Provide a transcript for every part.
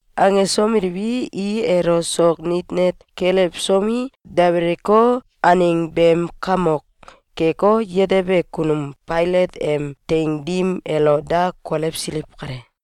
Angesomeliwi, i elo sok nit net kelewsomi, debeleko, aneng beem kamok keko, yetebe kunum Failat em teing dim elo da kolewsiliw kale.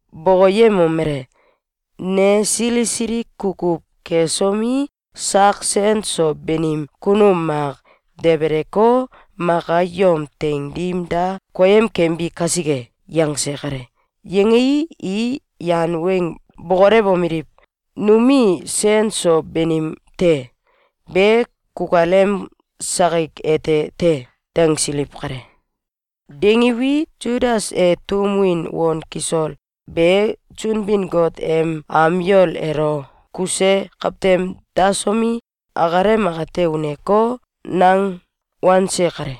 bokoyemomele: “Ne sili sili kukuw kesomi, sak sen so banim kunum mak debeleko, maka yom teing dim da koyem kembi kasike.”, yangse kale. Yangei, i yan weng bokolewomeliw: “Numie sen so banim te. Be kukalem sakik ete te!”, dangsiliw kale. Dangiwi, Sudas e tum win on kisol be Sunbin-Got em am yol elo kuse kawtem dasomi, akalem akate uneko, nang wanse kale.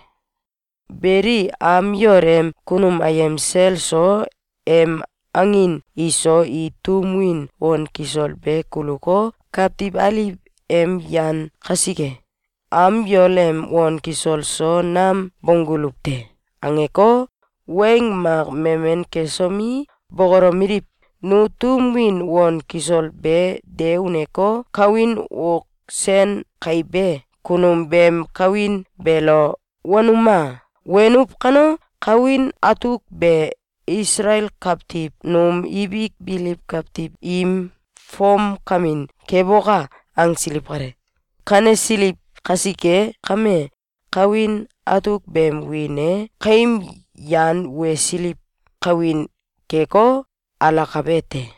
Beli, am yol em kunum ayem sel so, em angin iso, i tum win on kisol be kuluko, “Kawtiw aliw em yan kasike, am yol em on kisol so nam bongguluw te.”, angeko, weng mak memen kesomi, bokolomeliw: “Nu tum win on kisol be de uneko, kawin ok sen kaibe kunum beem kawin beelo wenuma! Wenuw kano, kawin atuk be Isalael kawtiw num ibik biliw kawiw im fomkamin keboka!”, angsiliw kale. Kanesiliw kasike kame, kawin atuk beem wiin e “Kaim Yan Wesiliw Kawin” keko, alakabe te.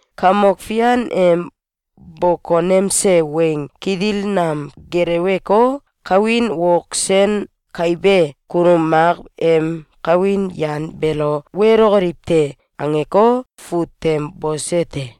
Kamok Fian em bokonemse weng kitil nam geleweko, kawin ok sen kaibe kunum mak em kawin yan beelo welokoliw te.”, angeko, fut tem bose te.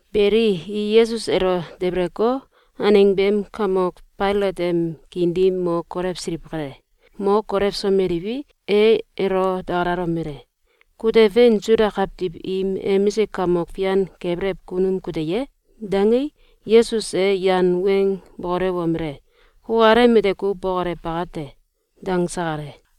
Beli, i Yesus elo debeleko, aneng beem kamok Failat em kiin dim mo kolewsiliw kale. Mo kolewsomeliwi, e elo dakalalomele: “Kute fein Suda kawtiw im emisik kamok fian kebelew kunum kute ye?”, dangei, Yesus e yan weng bokolewomele: “Kukalem ete kuw bokolew bakate”, dangse kale.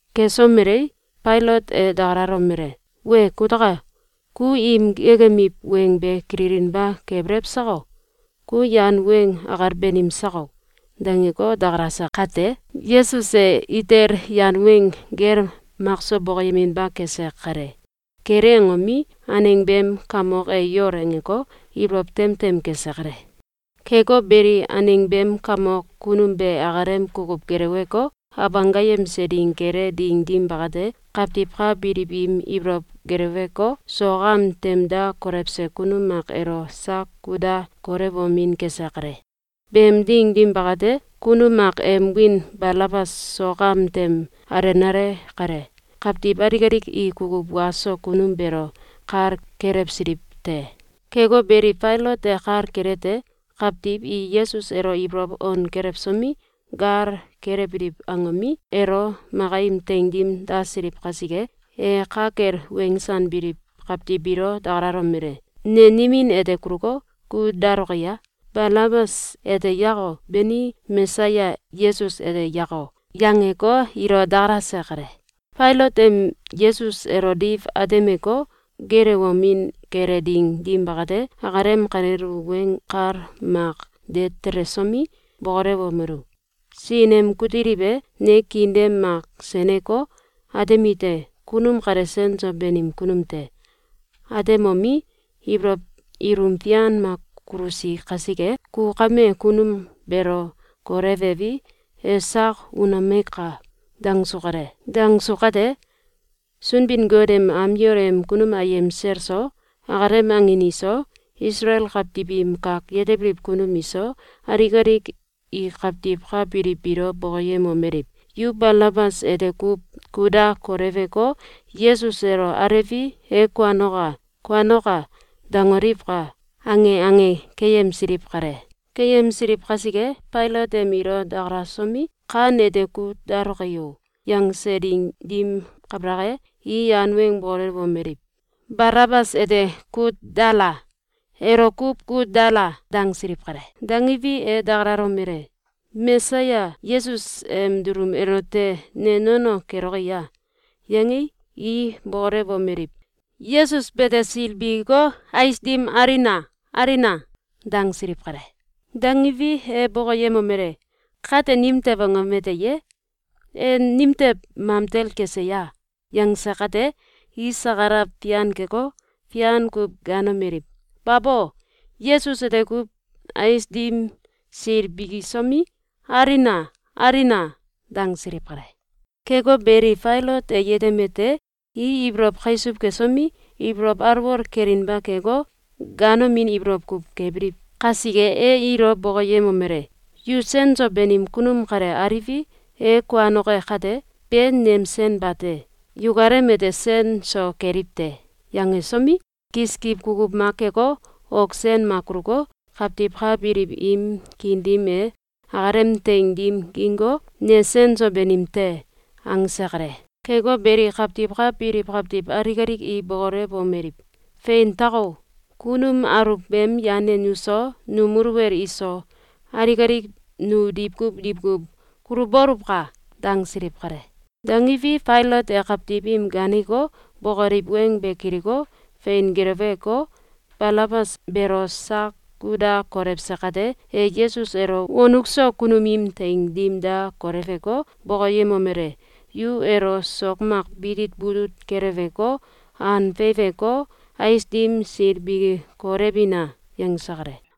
Kesomelei, Failat e dakalalomele: “Wee kutaka! Ku im geekemiw weng be kililinba kebelew sako? Ku yan weng akal banim sako?”, dangeko, dakalase kate, Yesus e itel yan weng gel makso bokoyeminba kese kale. Kele angomi, aneng beem kamok e yol angeko, ibolow tem tem kese kale. Keko beli, aneng beem kamok kunum be akalem kukuw geleweko, Abanggayemse Ding kele ding dim bakate, kawtiw ka biliw im ibolow geleweko, sok am tem da kolewse kunum mak elo sak kut da kolewomin kese kale. Beem ding dim bakate, kunum mak em wiin Balabas sok am tem alenale kale. Kawtiw alik alik i kukuw wa so kunum beelo kal kelewsiliw te. Keko beli, Failat e kal kelete: Kawtiw i Yesus elo ibolow on kelewsomi, gal kelewbiliw angomi, elo maka im teing dim dasiliw kasike, e ka kel wensanbiliw kawtiw biilo dakalalomele: “Ne nimin ete kuluko, kut daloki a? Balabas ete yako? Beni, Mesaya Yesus ete yako?”, yangeko, ilo dakalase kale. Failat em Yesus elo diw atemeko, geelewomin kele ding dim bakate, akalem kalel u weng kal mak de telesomi, bokolewomelu: “Sin em kutiliw e, ne kiin dem mak seneko, atemite: ‘Kunum kale sen so banim kunum te!’, atemomi, ibolow ilum fian mak kulusi kasike, ku kame kunum beelo kolewewi, e sak unomeka!”, dangsu kale. Dangsu kate, Sunbin-Got em am yol em kunum ayem sel so, akalem angin iso, Isalael kawtiw im kak yetebiliw kunum iso, alik alik i kawtiw ka biliw biilo bokoyemomeliw: “Yu ‘Balabas ete kuw kut da koleweko, Yesus elo alewi, e kuanoka! Kuanoka!’, dangoliwka!”, ange ange keyemsiliw kale. Keyemsiliw kasike, Failat em ilo dakalasomi, “Kan ete kut daloki o?”, yangse ding dim kabalak e, i yan weng bokolewomeliw: “Balabas ete kut dala! Elo kuw kut dala!”, dangsiliw kale. Dangiwi, e dakalalomele: “Mesayas Yesus em dulum elote ne nono keloki a?”, yangei, i bokolewomeliw: “Yesus bete sil bikiko, ais dim alina! Alina!”, dangsiliw kale. Dangiwi, e bokoyemomele: “Kate nimtew angom ete ye? E nimtew mamtel kese ya?”, yangse kate, i sakalaw fian keko, fian kuw gaanomeliw: “Babo! Yesus ete kuw ais dim sil bikisomi, alina! Alina!”, dangsiliw kale. Keko beli, Failat e yetemete: I ibolow kaisuw kesomi, ibolow alwol kelinba keko, ganomin ibolow kuw kebiliw kasike, e ilo bokoyemomele: “Yu sen so banim kunum kale aliwi, e kuanoke kate, be nem sen bate! Yukalem ete sen so keliw te.”, yangesomi, kiskiw kukuw mak keko, ok sen mak kuluko, kawtiw ka biliw im kiin dim e, akalem teing dim gingko, “Ne sen so banim te!”, angse kale. Keko beli, kawtiw ka biliw kawtiw alik alik i bokolewomeliw: “Fein tako! Kunum aluw beem yan e nuso, num muluwel iso, alik alik nu diwkuw diwkuw kuluboluwka!”, dangsiliw kale. Dangiwi, Failat e kawtiw im gaaneko, bokoliw weng be kiliko, fein geleweko, Balabas beelo sak kut da kolewse kate, e Yesus elo wonuk so kunum im teing dim da koleweko, bokoyemomele: “Yu elo sok mak bitit butut keleweko, an feiweko, ais dim sil biki kolewina!”, yangse kale.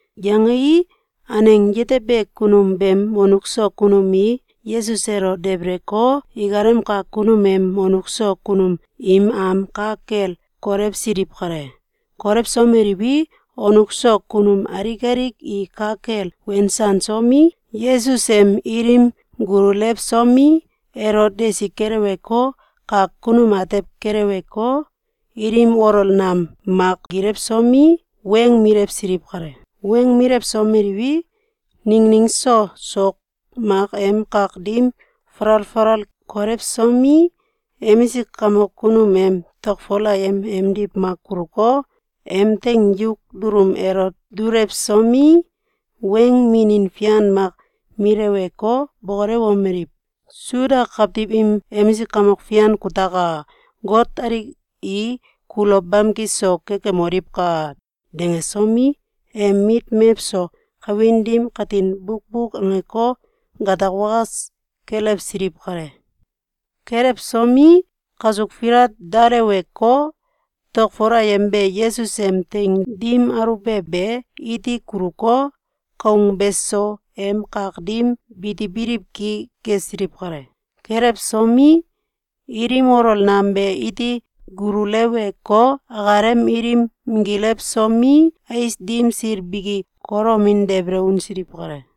Yangei, aneng yetebe kunum beem wonuk so kunum i Yesus elo debeleko, ikalem kak kunum em wonuk so kunum im am ka kel kolewsiliw kale. Kolewsomeliwi, wonuk so kunum alik alik i ka kel wensansomi, Yesus em ilim gululewsomi, elo desi kelewko, kak kunum atew kelewko, ilim olol nam mak minggilewsomi, weng milewsiliw kale. Weng milewsomeliwi, ningning so sok mak em kak dim falal falal kolewsomi, emisik kamok kunum em tokfol ayem emdiw mak kuluko, em teing yuk dulum elo dulewsomi, weng minin fian mak mileweko, bokolewomeliw: “Suda kawtiw im emisik kamok fian kutaka! Got alik i kulo bamki so kekemoliwka!”, dangsomi, em mit mewso kawin dim katin bukbuk angeko, gatak wakas kelewsiliw kale. Kelewsomi, kasuk filat daleweko, tokfol ayem be Yesus em teing dim aluwbe be iti kuluko, koung beso em kak dim bitibiliw ki kesiliw kale. Kelewsomi, ilim olol nam be iti gululeweko, akalem ilim minggilewsomi, ais dim sil biki kolomin debele unsiliw kale.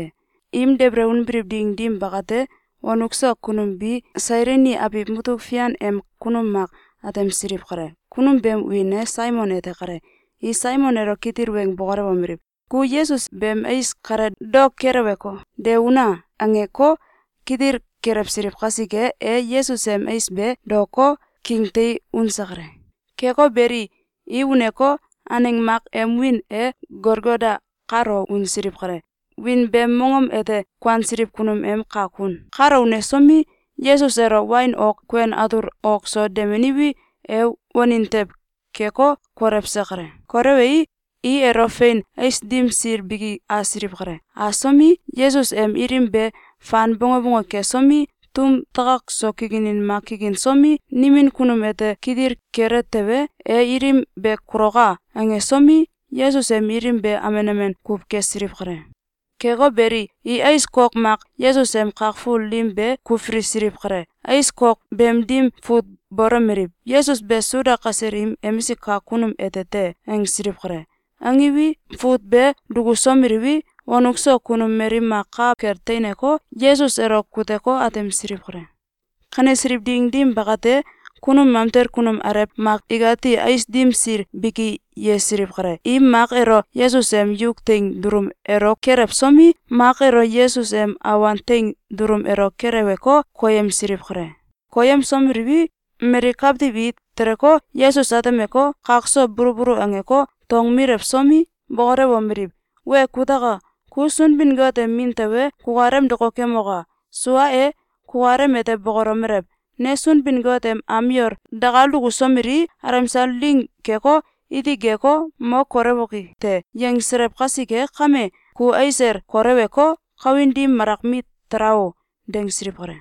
Im debele unbiliw ding dim bakate, wonuk so kunum bi Sailini abiw mutuk fian em kunum mak atemsiliw kale. Kunum beem wiin e Saimon ete kale. I Saimon elo kitil weng bokolewomeliw: “Ku Yesus beem ais kale daok keleweko, de una!”, angeko, kitil kelewsiliw kasike, e Yesus em ais be daoko, kingtei unse kale. Keko beli, i uneko, aneng mak em wiin e Golgota kalo unsiliw kale. Wiin beem mongom ete “Kuansiliw Kunum em Kak Kun”. Kalo unesomi, Yesus elo wain ok kuen atul ok so demeniwi, e wanin tew keko, kolewse kale. Kolewei, i elo fein ais dim sil biki asiliw kale. Asomi, Yesus em ilim be fan bonge bonge kesomi, tum takak so kikinin mak kikinsomi, “Nimin kunum ete kitil kele tewe, e ilim be kuloka!”, angesomi, Yesus em ilim be amen amen kuw kesiliw kale. Keko beli, i ais kok mak Yesus em kak ful dim be kulfilisiliw kale. Ais kok beem dim fut bolomeliw: “Yesus be Suda kasel im emisik kamok kunum ete te!”, angsiliw kale. Angiwi, fut be dukusomeliwi, wonuk so kunum mali mak ka kel teineko, Yesus elo kuteko, atemsiliw kale. Kanesiliw ding dim bakate, kunum mamtel kunum alew mak ikati ais dim sil biki yesiliw kale. I mak elo Yesus em yuk teing dulum elo kelewsomi, mak elo Yesus em awan teing dulum elo keleweko, koyemsiliw kale. Koyemsomeliwi, mali kawtiw i teleko, Yesus atemeko, kak so bulu bulu angeko, tong milewsomi, bokolewomeliw: “Wee kutaka! Ku Sunbin-Got em Min tewe, kukalem dokokemoka! Sua e, kukalem ete bokolomelew: ‘Ne Sunbin-Got em am yol dakal dukusomelii, alemsal ding keko, iti geko, mo kolewoki te!’, yangselew kasike kame, ku ais el kolewko, kawin dim malak mit tala o!”, dangsiliw kale.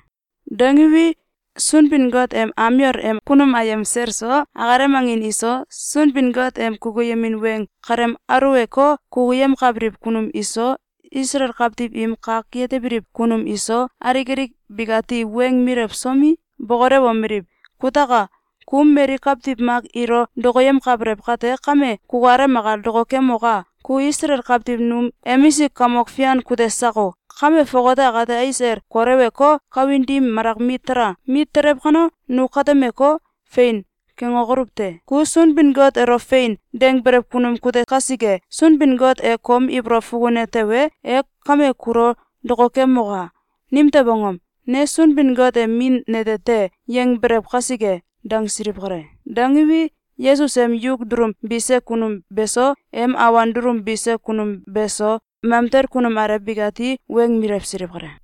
Dangiwi, Sunbin-Got em am yol em kunum ayem sel so, akalem angin iso, Sunbin-Got em kukuyemin weng kalem aulewko, kukuyemkabiliw kunum iso, Isalael kawtiw im kak yetebiliw kunum iso, alik alik bikati weng milewsomi, bokolewomeliw: “Kutaka! Ku mali kawtiw mak ilo dokoyemkabelew kate kame, kukalem akal dokokemoka! Ku Isalael kawtiw num emisik kamok fian kute sako? Kame fongate akate ais el koleweko, kawin dim malak mit tala! Mit telew kano, nu katemeko, ‘Fein!’, kangokoluw te! Ku Sunbin-Got elo ‘Fein!’, dangbiliw kunum kute kasike, Sunbin-Got e kom ibolow fukune tewe, e kame kulo dokokemoka! Nimtew angom? ‘Ne Sunbin-Got em Min nete te!’, yangbelew kasike!”, dangsiliw kale. Dangiwi, Yesus em yuk dulum bise kunum be so, em awan dulum bise kunum be so, mamtel kunum alew bikati weng milewsiliw kale.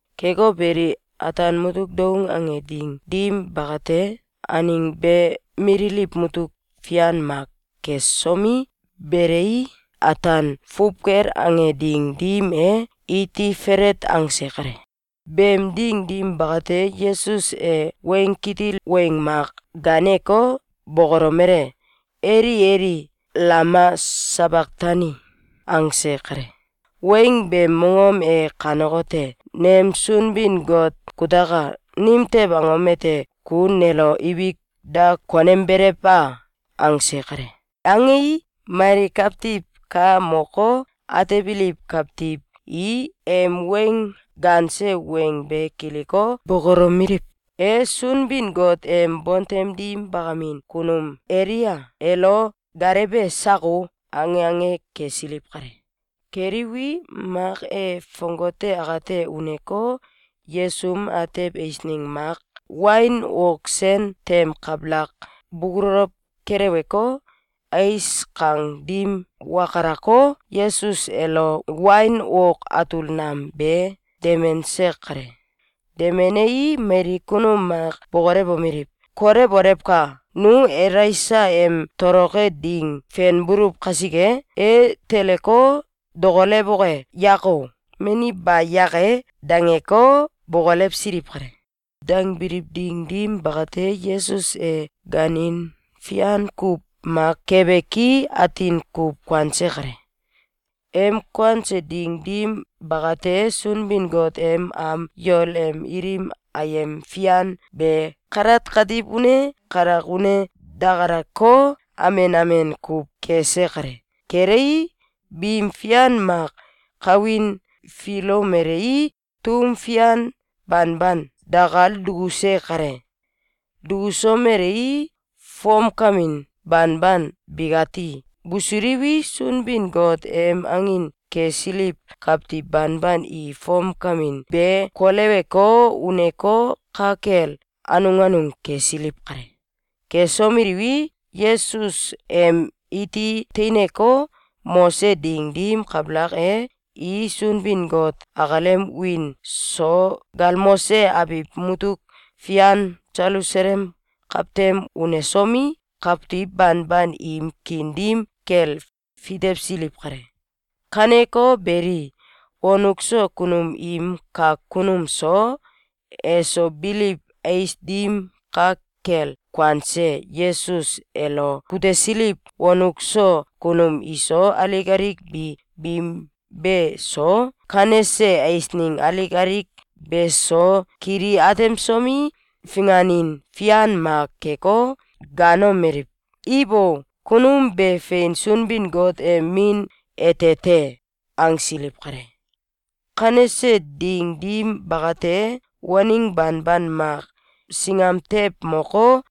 Keko beli, ataan mutuk doung ange ding dim bakate, aneng be mililiw mutuk fian mak kesomi, belei, ataan fuwkel ange ding dim e, iti felet angse kale. Beem ding dim bakate, Yesus e weng kitil weng mak gaaneko, bokolomele: “Eli, Eli, alama sabaktani?”, angse kale. Weng beem mongom e kanekote: “Nem Sunbin-Got kutaka! Nimtew angom ete ku nelo ibik da konembelew a?”, angse kale. Angei, mali kawtiw ka moko, atebiliw kawtiw i em weng gaanse weng be kiliko, bokolomeliw: “E Sunbin-Got em bontem dim bakamin kunum Elia elo gaalewbe sako!”, ange ange kesiliw kale. Keliwi, mak e fongate akate uneko, yesum atew eiseng mak wain ok sen tem kabalak bubulow keleweko, ais kang dim wakalako, Yesus elo wain ok atul nam be demense kale. Demenei, mali kunum mak bokolewomeliw: “Kolewolewka! Nu Elaisa em toloke ding fenbuluw kasike! E teleko, dokolewoke yako, mani ba yake!”, dangeko, bokolewsiliw kale. Dangbiliw ding dim bakate, Yesus e gaanin fian kuw mak kebe ki, atin kuw kuanse kale. Em kuanse ding dim bakate, Sunbin-Got em am yol em ilim ayem fian be kalat katiw une, kalak une dakaleko, amen amen kuw kese kale. Kelei, bim fian mak kawin filomelei, tum fian banban dakal dukuse kale. Dukusomelei, fomkamin banban bikati busuliwi, Sunbin-Got em angin kesiliw kawtiw banban i fom kawin be koleweko, uneko, ka kel anung anung kesiliw kale. Kesomeliwi, Yesus em iti teineko, mose ding dim kabalak e, i Sunbin-Got akalem wiin so galmose abiw mutuk fian Selusalem kawtem unesomi, kawtiw banban im kiin dim kel fitewsiliw kale. Kaneko beli, wonuk so kunum im kak kunum so, eso biliw ais dim ka kel kuanse Yesus elo kutesiliw wonuk so kunum iso, alik alik bi bim be so, kanese eisneng alik alik be so, kili atemsomi, finganin fian mak keko, gaanomeliw: “Ibo! Kunum be fein Sunbin-Got em Min ete te!”, angsiliw kale. Kanese ding dim bakate, waneng banban mak singam tew moko,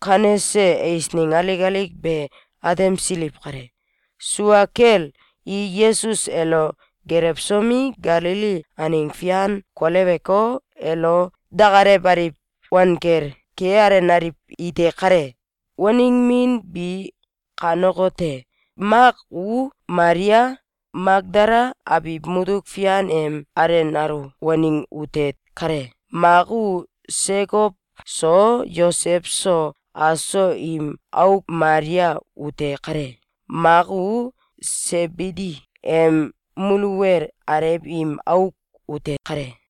kanese eisneng alik alik be atemsiliw kale. Sua kel, i Yesus elo gelewsomi, Galili aneng fian koleweko, elo dakalewaliw wanggel kealenaliw ite kale. Waneng min bi kanekote: Mak u Malia, Makdala abiw mutuk fian em alenalu waneng ute kale. Mak u Sekow so Yosew so, aso im auk Malia ute kale. Mak u Sebidi em muluwel alew im auk ute kale.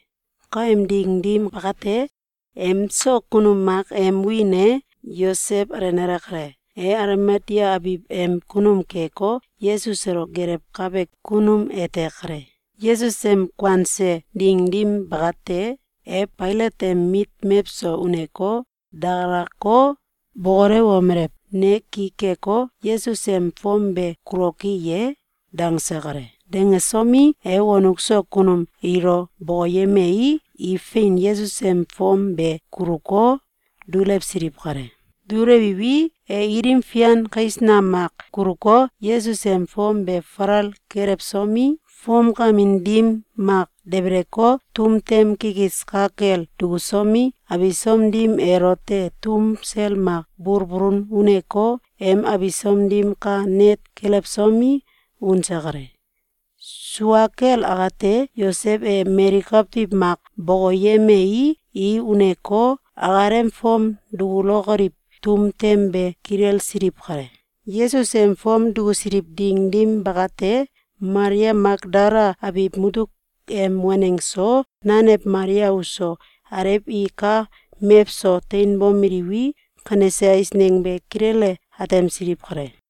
Kaem ding dim bakate, emso kunum mak em wiin e Yosew alenale kale. E Alimatea abiw beem kunum keko, Yesus elo gelewkabe kunum te kale. Yesus em kuanse ding dim bakate, e Failat em mit mewso uneko, dakalako, bokolewomele: “Ne ki keko, Yesus em fom be kuloki ye?”, dangse kale. Dangesomi, e wonuk so kunum ilo bokoyemei, i fein, Yesus em fom be kuluko, dulewsiliw kale. Dulewiwi, e ilim fian kais nam mak kuluko, Yesus em fom be falal kelewsomi, fomkamin dim mak debeleko, tum tem kikis ka kel dukusomi, abisom dim elote tum sel mak bulbulun uneko, em abisom dim ka net kelewsomi, unse kale. Sua kel akate, Yosew e mali kawtiw mak bokoyemei, i uneko, akalem fom dukulokoliw tum tem be kilelsiliw kale. Yesus em fom dukusiliw ding dim bakate, Malia Makdala abiw mutuk em waneng so, nanew Malia uso, alew i ka mewso teinbomeliwi, kanese eisneng be kilele atemsiliw kale.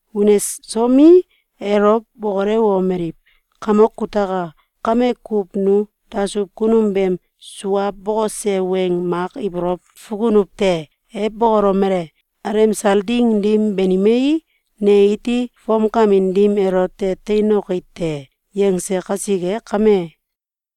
Unesomi, elo bokolewomeliw: “Kamok kutaka! Kame kuw nu dasuw kunum beem sua bokose weng mak ibolow fukunuw te. E bokolomele: ‘Alemsal ding dim banimei, ne iti fomkamin dim elote teinoki te!’, yangse kasike kame,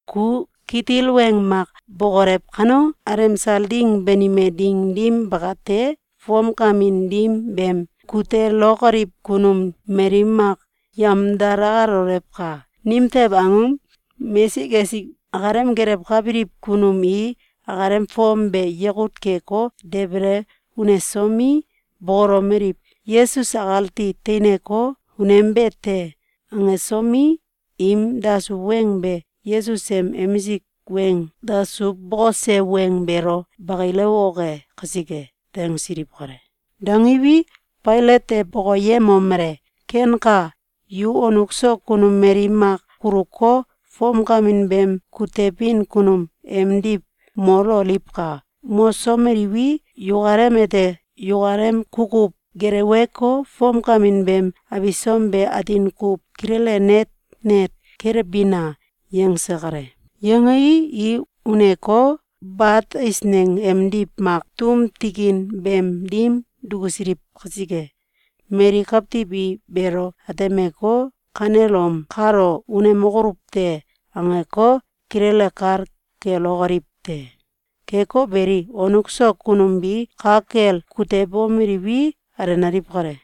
ku kitil weng mak bokolew kano, alemsal ding banime ding dim bakate, fomkamin dim beem kutelokoliw kunum mali mak yemdalalolewka! Nimtew angom? Mesik esik akalem gelewkabiliw kunum i akalem fom be yakut keko, debele unesomi, bokolomeliw: ‘Yesus akati teinko, unembe te!’, angesomi, im dasuw weng be Yesus em emisik weng dasuw bokose weng beelo bakilewoke kasike.”, dangsiliw kale. Dangiwi, Failat e bokoyemomele: “Kenka! Yu wonuk so kunum mali mak kuluko, fomkamin beem kutebin kunum emdiw mololiwka! Mosomeliwi, yukalem ete yukalem kukuw geleweko, fomkamin beem abisom be atin kuw kilele net net kelewbina!”, yangse kale. Yangei, i uneko, bat eisneng emdiw mak tum tikin beem dim dukusiliw kasike, mali kawtiw i beelo atemeko, “Kanelom kalo unemokoluw te!”, angeko, kilele kal kelokoliw te. Keko beli, wonuk so kunum bi ka kel kutebomeliwi, alenaliw kale.